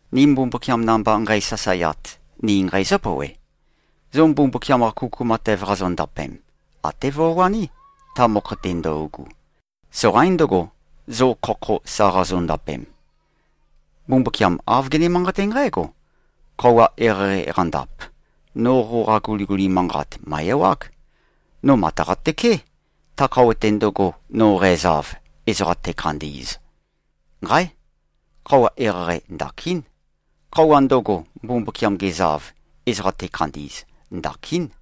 Ni Mbumbukiam namba nqeisasaeat, ni nqeizǿ-pouwe: Zo Mbumbukiam-qa kuku matev qazondapem, até vøwaní, ta mokho-te ndøugu. Soqaín ndøgo, zo khokho sa qazondapem. Mbumbukiam āv gene-manqaté nqǽgo, “Khøuwa eqeieqei qandap, no qoqa guliguli manqat mø̀e-ewág. No màtaqa-tøké, ta khøuwa-te ndøgo, no qæzav, ezoqa tækhandi꞉z.” Nqáe! Khøuwa eqeieqei ndakín. Khøuwa ndøgo, Mbumbukiam gezav, ezoqa tekhandi꞉z, ndakín.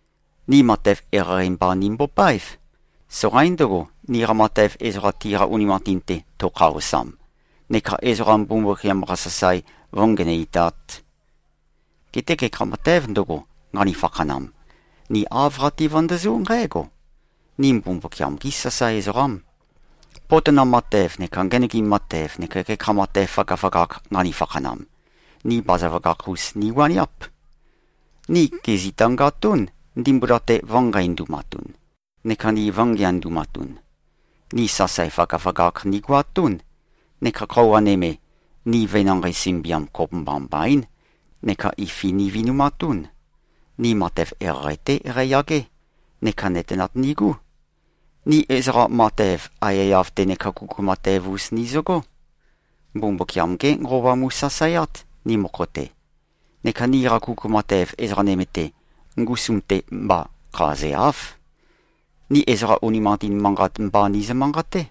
Ni matev eqeieqei mba nimbopáev. Soqaín ndøgo, niqa matev ezoqa tiqa unimanqatin-te tøkhaosam neka ezoqa Mbumbukiam-qa sasae vǿngenøitāt. Geté gekha matēv ndøgo, nqani-fakhanam, ni āv qati-vøndøzú nqǽgo: Ni Mbumbukiam-gí sasae ezoqám. Potonam matev neka ngenøgim matev neka gekha matev føgøføgakh nqani-fakhanam, ni bazaføgakh-us niwaniáp. Ni gèzitangatún, ndimbula-te vø̄nqeindumatun. Neka ni vø̄ngeandumatun. Ni sasae føgøføgakh nigoatún, neka khøuwa nøme, ni venanqei sømbiam kopømba mbaín, neka ifi nivinumatún. Ni matev eqeieqei-té qeiyagé, neka nøtenat nigú. Ni ezoqa matev aiyaiyav-te neka kuku matev-us nizøgó. Mbumbukiam-gé Nqova mu꞉sasaeát, ni mokho-te. Neka niqa kuku matev, ezoqa nøme-te, ngusum-te mba khazeáv. Ni ezoqa unimanqatin manqat mba nizø-manqaté.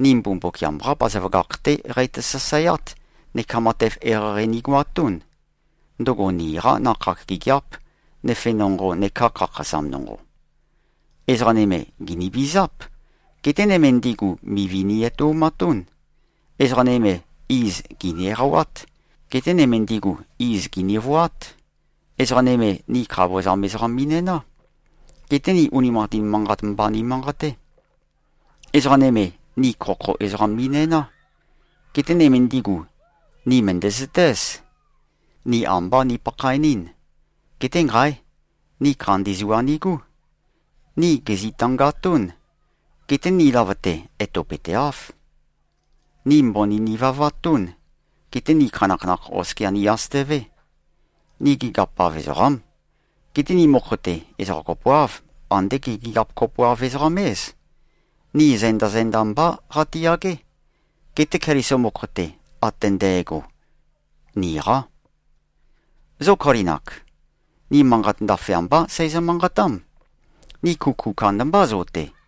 Ni Mbumbukiam-qá bazaføgakh-té qeitø-sasaeát neka matev eqeieqei nigoatún. Ndøgo niqá nakhag gigiáp, nøfe nonqo neká khakhazam nonqo. Ezoqa nøme, gìnivizáp. Geté nøme ndigu, mivi ni-etoumatún. Ezoqa nøme, iz gìni-eqawát. Geté nøme ndigu, iz gìnivoát. Ezoqa nøme, ni khavozam ezoqam mi꞉næná. Geté ni unimanqatin manqat mba nimanqaté. Ezoqa nøme, ni khokho ezoqam mi꞉næná. Geté nøme ndigu, ni mø̀ndæzøtéz. Ni ambá nipakhaenɨ́n. Geté, nqáe! Ni khandi zua nigú. Ni gèzitangatún. Geté ni løvøte, etopøteáv. Ni mbøni nivavatún. Geté ni khanakhanakh oskia ni-asøtøvé. Ni gigiap-av ezoqám. Geté ni mokho-te, ezoqa kopoáv, andé ge꞉-gigiap-kopoav-ezoqam-éz. Ni zenda-zenda mbá qatiyagé. Geté Keliso mokho-te, ate ndægo, niqá. Zo Kolin-ak. Ni manqat ndaføyambá seizø-manqatám. Ni kuku kandambá zo-te.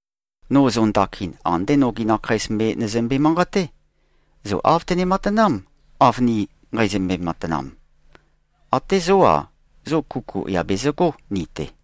No zo ndakin, andé nogi nakheis me nøzømbe-manqaté. Zo āv tøne-matanám, av ni nqeizømbe-matanam. Até zó-a, zo kuku yà bezøgó ni-te.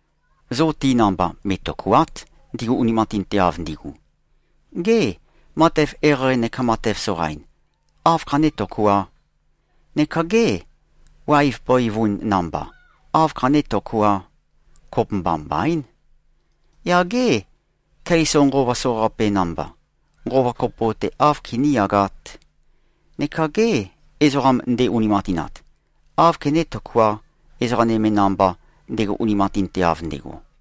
Zo ti namba me꞉tøkùa᷄t, ndigu unimanqatinteav ndigu. Gê, matev eqeieqei neka matev soqain, áv khané-tøkuā? Neka gê, waev bøivun namba, áv khané-tøkuā? Kopømba mbaín! Yaq gê, Keliso nqova soqaqape namba, nqova kopo-te áv kiníyagāt? Neka gê, ezoqam nde-unimanqatinat, áv kené-tøkuā, ezoqa nøme namba, ndego unimanqatinteav ndego?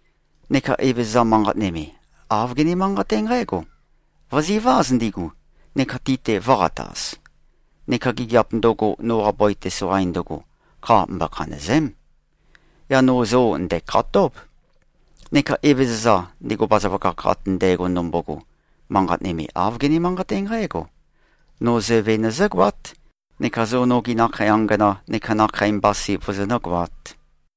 Neka Evezøza manqat nøme, āv gene-manqaté nqǽgo: Vø̀ziváz ndigu, neka ti-te vø̄qataz. Neka gigiap ndøgo, noqa bøi-te soqain ndøgo, kha mbokhanø̀ze᷄m. Yaq no zo ndæ̀khatób. Neka Evezøza, ndego bazaføgakh ate ndægo ndømbogo, manqat nøme āv gene-manqaté nqǽgo: No Zøve nøzǿgoát neka zo nogi nakhei angana neka nakhei mbasi vozonǿ-goāt.”